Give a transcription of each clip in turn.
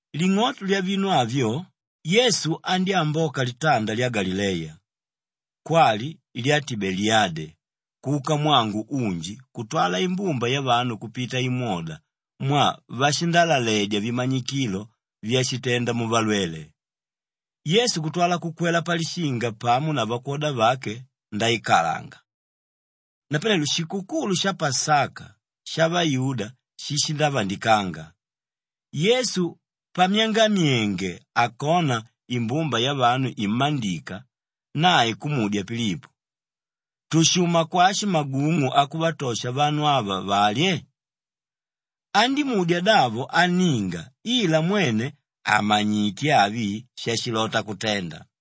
Ling'oto lyavinu avyo Yesu andyámboka litanda lya Galileya, kwali lya Tibeliyade, kuka mwangu unji kutwala imbumba yavanu kupita imwoda mwaa vashindalaledya vimanyikilo vyashitenda muvalwele. Yesu kutwala kukwela palishinga pamo na vakwoda vake ndaikalanga. Napanelo shikukulu sha Pasaka shavayuda shishindavandikanga. Yesu pamyangamyenge akona imbumba yavanu immandika nae kumudya Pilipo, “Tushuma kwashi magung'u akuvatosha vanu ava valye?” Andímudya davo anninga ila mwene àmanyite avi shashilota kutenda.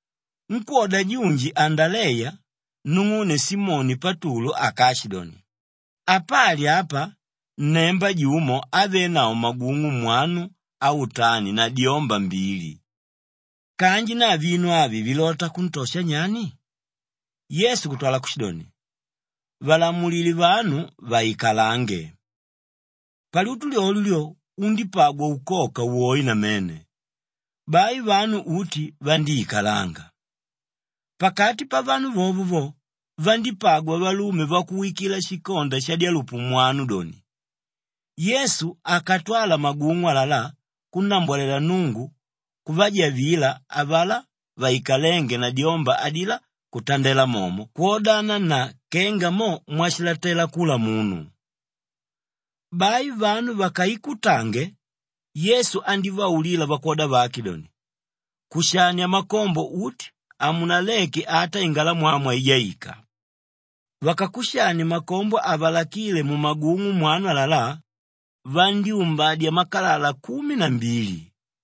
Nkwóda junji Andaleya, nung'une Simoni Patulu akaashidoni, “Apali apa nnemba jumo ávenavo magung'u mwanu autani na dyomba mbili. Kanji na vinu avi vilota kuntosha nyani?” Yesu kutwala kushidoni, “Valamulile vanu vaikalange.” Palyutu lyolyo lyo undípagwa ukoka woe namene, bai vanu uti vandíikalanga. Pakati pavanu vovo vo, vandípagwa valume vakuwikila shikonda shadyalupu mwanu doni. Yesu akatwala magung'u alalá kunnambwalela Nnungu, kuvajavila avalá vaikalénge na dyomba adilá kutandela momo kwodana na kenga mo mwashilatela kula munu. Bai vanu vakaikutange, Yesu andívaulila vakwoda vake doni, “Kushania makombo uti, hamunaleke ata ingalamwamwa ijaika.” Vakakushanie makombo avalakíle mumagung'u mwanu alalá, vandyúmbadya makalala kumi na mbili.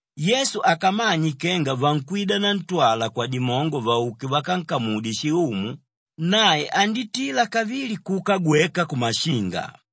Yesu akamanye kenga vankwida nantwala kwadimongo vauke vakankamudye shiumu, nae andítila kavili kuka gweka kumashinga.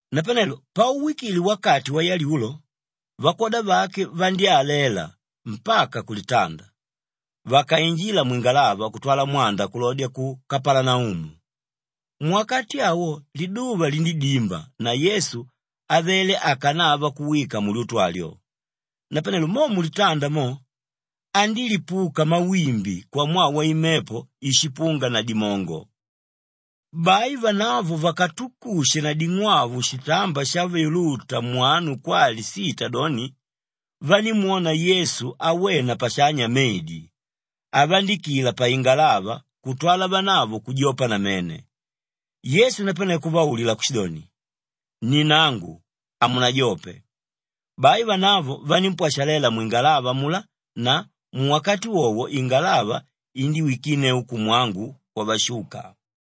Napanelo pauwikile wakati wayalyulo, vakwoda vake vandyálela mpaka kulitanda. Vakainjila mwingalava kutwala mwanda kulodya ku Kapalanaumu. Muwakati awo liduva lindídimba na Yesu avele akanava kuwika mulyutu alyo. Napanelo mo mulitanda mo, andílipuka mawimbi kwamwaa waimepo íshipunga na dimongo. Bai vanavo vakatukushe na ding'wau shitamba shavyuluta mwanu kwali sita doni, vanímwona Yesu awena pashanya medi avandikila paingalava kutwala vanavo kujopa namene. Yesu napane kuvaulila kushidoni, “Ni nangu, hamunajope!” Bai vanavo vanímpwashalela mwingalava amulá na muwakati wowo ingalava indíwikinneu kumwangu kwavashuka.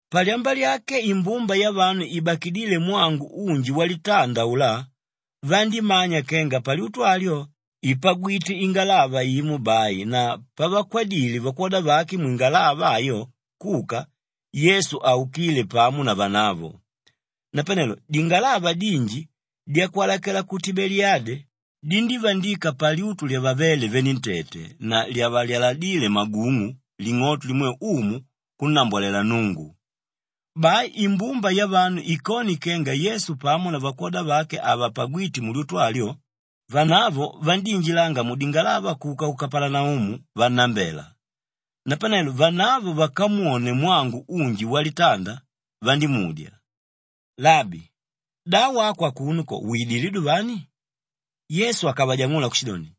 Palyamba lyake imbumba yavanu ibakidíle mwangu unji walitanda aulá vandímanya kenga palyutu alyo ìpagwite ingalava imo bai na pavakwadile vakwoda vake mwingalava ayo kuka, Yesu haukíle pamo na vanavo. Napanelo dingalava dinji dyakwalalakela ku Tibeliyade dindívandika palyutu lyavavéle venentete na lyavalyaladíle magung'u ling'oto limwe Umu kunnambwalela Nnungu. Bai imbumba yavanu ikone kenga Yesu pamo na vakwoda vake havapagwite mulyutu alyo, vanavo vandíinjilanga mudingalava kuka ku Kapalanaumu vannambela. Napanelo vanavo vakamwone mwangu unji walitanda, vandímudya, “Labi, da wako akuno ko widilé duvani?” Yesu akavajang'ula kushidoni,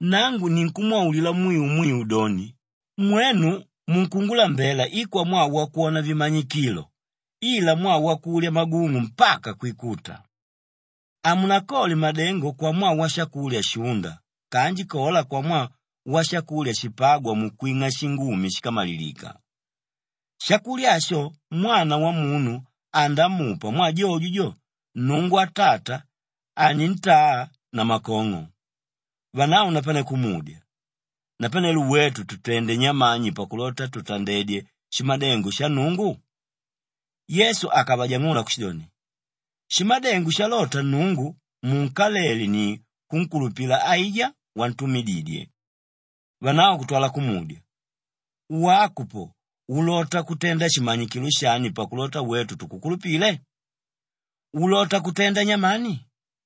“Nangu ninkumwaulila mwiu mwiu doni, mwenu munkungulambela i kwamwaa wakwona vimanyikilo ila mwaa wakulya magung'u mpaka kwikuta. Hamunakole madengo kwamwaa washakulya shúnda kanji kola kwamwaa washakulya shipágwa mukwing'a shingumi shíkamalilika. Shakulya asho Mwana Wamunu andamupa mwaa jojo jo, Nnungu Atata anintaa namakong'o.” Vanavo napane kumudya, “Napanelo wetu tutende nyamani pakulota tutandedye shimadengo sha Nnungu?” Yesu akavajang'ula kushidoni, “Shimadengo shalota Nnungu munkalele ni kunkulupila aijá wantumididye.” Vanavo kutwala kumudya, “Wako po ulota kutenda shimanyikilo shani pakulota wetu tukukulupile? Ulota kutenda nyamani?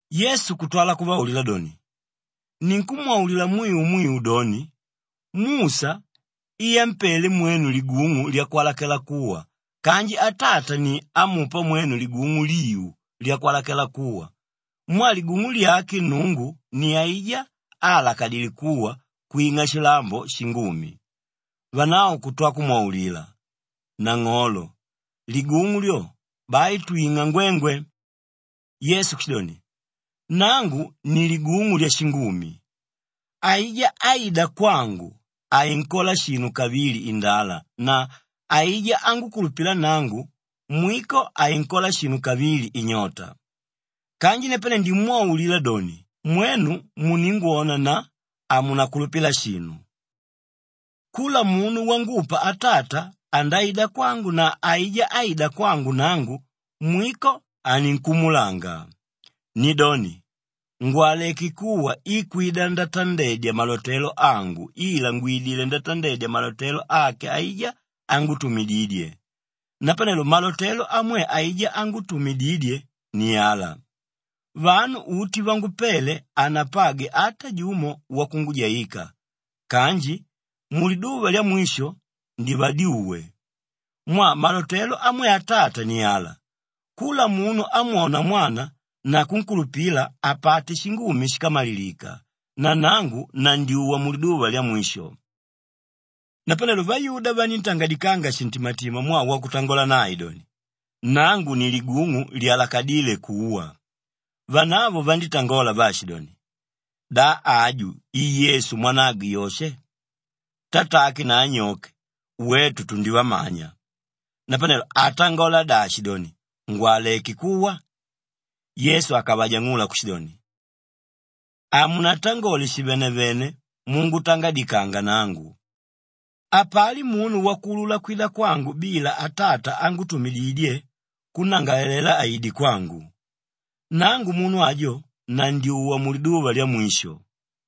Yesu kutwala kuvaulila doni, “Ninkumwaulila mwiu mwiu doni, Musha i ámpele mwenu ligung'u lyakwalakela kuwa kanji Atata ni ámupa mwenu ligung'u liu lyakwalakela kuwa mwaa ligung'u lyake Nnungu ni aijá áalakadile kuwa kwing'a shilambo shingumi.” Vanavo kutwa kumwaulila, “Nang'olo, ligung'u lyo, bai twing'a ngwengwe!” Yesu kushidoni, “Nangu ni Ligung'u Lyashingumi. Aijá áida kwangu, hainkola shinu kavili indala na aijá ángukulupila nangu, mwiko hainkola shinu kavili inyota. Kanji napane ndimwaulila doni, mwenu muningwona na hamunakulupila shinu. Kula munu wangupa Atata andaida kwangu na aijá áida kwangu nangu, mwiko haninkumulanga. Nidoni, ngwaleké kuwa i kwida ndatandedya malotelo angu ila ngwidilé ndatandedya malotelo ake aijá ángutumididye. Napanelo malotelo amwe aijá ángutumididye ni ala, vanu uti vangupele, hanapagwe ata jumo wakungujaika kanji muliduva lyamwisho, ndivadyuwe. Mwaa malotelo amwe Atata ni ala, kula munu ámwona Mwana na kunkulupila apate shingumi shíkamalilika na nangu nandyuwa muliduva lyamwisho.” Napanelo vayuda vaníntangadikanga shintimatima mwaa wakutangola nae doni, “Nangu ni ligung'u lyalakadíle kuwa.” Vanavo vandítangola vaashidoni, “Da aju i Yesu mwanagwe Yoshe? Tatake na anyoke, wetu tundivamanya. Napanelo atangola dashi doni, ‘Ngwaleké kuwa’?” Yesu akavajang'ula kushidoni, “Hamunatangole shivenevene mungutangadikanga nangu! Hapali munu wakuulula kwida kwangu bila Atata ángutumididye kunnangalalela aide kwangu. Nangu munu ajo, nandyuwa muliduva lyamwisho.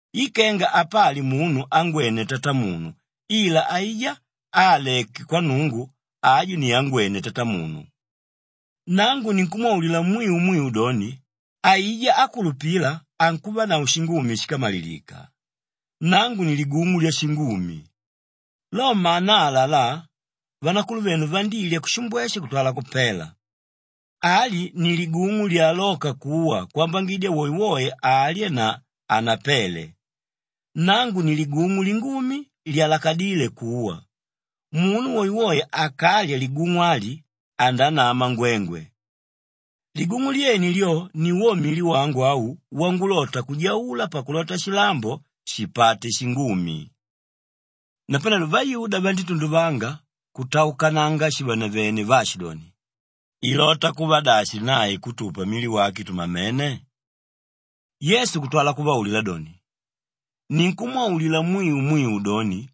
I kenga apali munu ángwene Tatamunu ila aijá áaleke kwa Nnungu, aju ni ángwene Tatamunu. Nangu ninkumwaulila mwiu mwiu doni, aijá ákulupila ankuvanavo shingumi shíkamalilika. Nangu ni ligung'u lyashingumi. Lo manaa alalá, vanakuluvenu vandilya kushimbweshe kutwala kupela. Ali ni ligung'u lyalóka kuwa kwambangidya woewoe alye na hanapele. Nangu ni ligung'u lingumi lyalakadíle kuwa. Munu woewoe akalya ligung'u ali andanama ngwengwe. Ligung'u lyene lyo ni wo mili wangu au wangulota kujaula pakulota shilambo shipate shingumi.” Napanelo vayuda vandítunduvanga kutaukananga shivenevene vaashidoni, “Ilota kuva dashi nae kutupa mili wake tumamene?” Yesu kutwala kuvaulila doni, “Ninkumwaulila mwiu mwiu doni,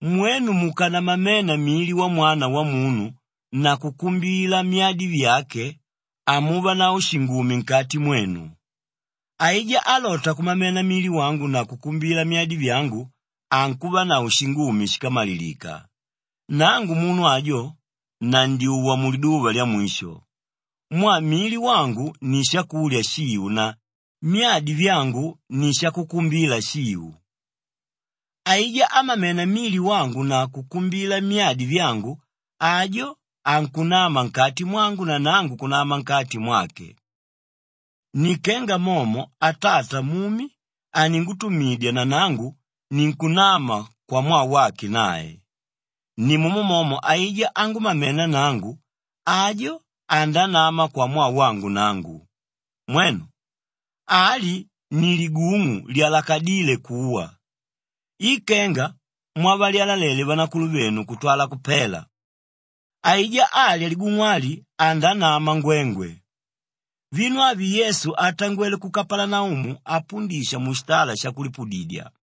mwenu mukanamamena mili wa Mwana Wamunu na kukumbila myadi vyake hamuvanavo shingumi nkati mwenu. Aijá álota kumamena mili wangu na kukumbila myadi vyangu ankuvanavo shingumi shíkamalilika. Nangu munu ajo, nandyuwa muliduva lyamwisho. Mwaa mili wangu ni shakulya shiu na myadi vyangu ni shakukumbila shiu. Aijá ámamena mili wangu na kukumbila myadi vyangu, ajo ankunama nkati mwangu na nangu kunama nkati mwake. Ni kenga momo Atata mumi aningutumidya na nangu ninkunama kwamwaa wake nae, nimumo momo aijá ángumamena nangu, ajo andanama kwamwaa wangu nangu. Mwenu! Ali ni ligung'u lyalakadíle kuwa. I kenga mwavalyalalele vanakuluvenu kutwala kupela; aijá álya ligung'u ali andanama ngwengwe.” Vinu avi Yesu atangwele ku Kapalanaumu apundisha mushitala shakulipudidya.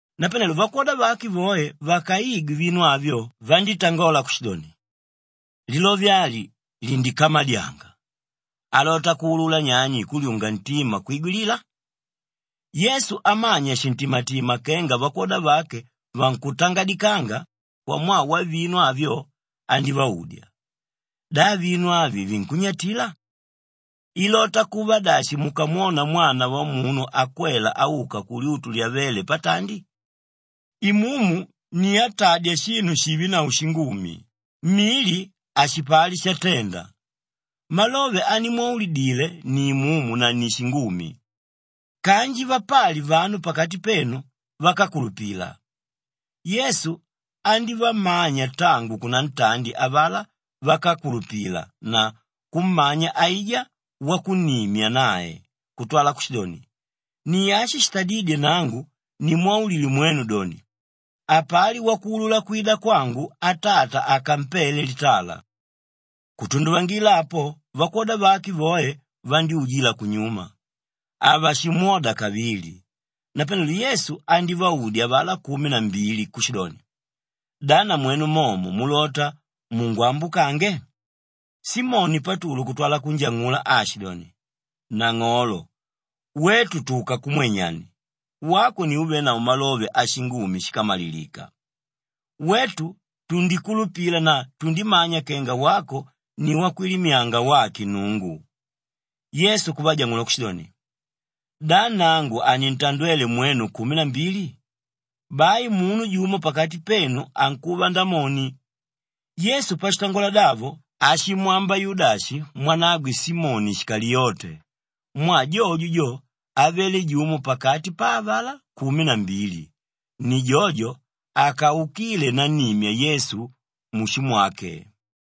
Napanelo vakwoda vake voe vakaigwe vinu avyo vandítangola kushidoni, “Lilove ali lindikamadyanga. Alota kuulula nyani kulyunga ntima kwigwilila?” Yesu amanya shintimatima kenga vakwoda vake vankutangadikanga kwamwaa wavinu avyo, andívaudya, “Da vinu avi vinkunnyatila? Ilota kuva dashi mukamwona Mwana Wamunu akwela auka kulyutu lyavéle patandi? Imumu ni átadya shinu shivenavo shingumi, mili hashipali shatenda. Malove animwaulidile ni imumu na ni shingumi. Kanji vapali vanu pakati penu vákakulupila.” Yesu andívamanya tangu kunantandi avalá vákakulupila na kummanya aijá wakunnimya nae kutwala kushidoni, “Ni ashi shitadídye nangu nimwaulile mwenu doni, hapali wakuulula kwida kwangu Atata akampele litala.” Kutunduvangila apo vakwoda vake voe vandyújila kunyuma, havashimwoda kavili. Napanelo Yesu andívaudya avalá kumi na mbili kushidoni, “Da namwenu momo mulota mungwambukange?” Simoni Patulu kutwala kunjang'ula aashidoni, “Nang'olo, wetu tuka kumwe nyani? Wako ni úvenavo malove ashingumi shíkamalilika. Wetu tundikulupila na tundimanya kenga wako ni Wakwilimyanga wake Nnungu.” Yesu kuvajang'ula kushidoni, “Da nangu hanintandwele mwenu kumi na mbili? Bai munu jumo pakati penu ankuva Ndamoni.” Yesu pashitangola davo ashimwamba Yudashi mwanagwe Simoni Shikaliyote mwaa jojo jo, avele jumo pakati pa avalá kumi na mbili, ni jojo akaukíle nannimya Yesu mushumwake.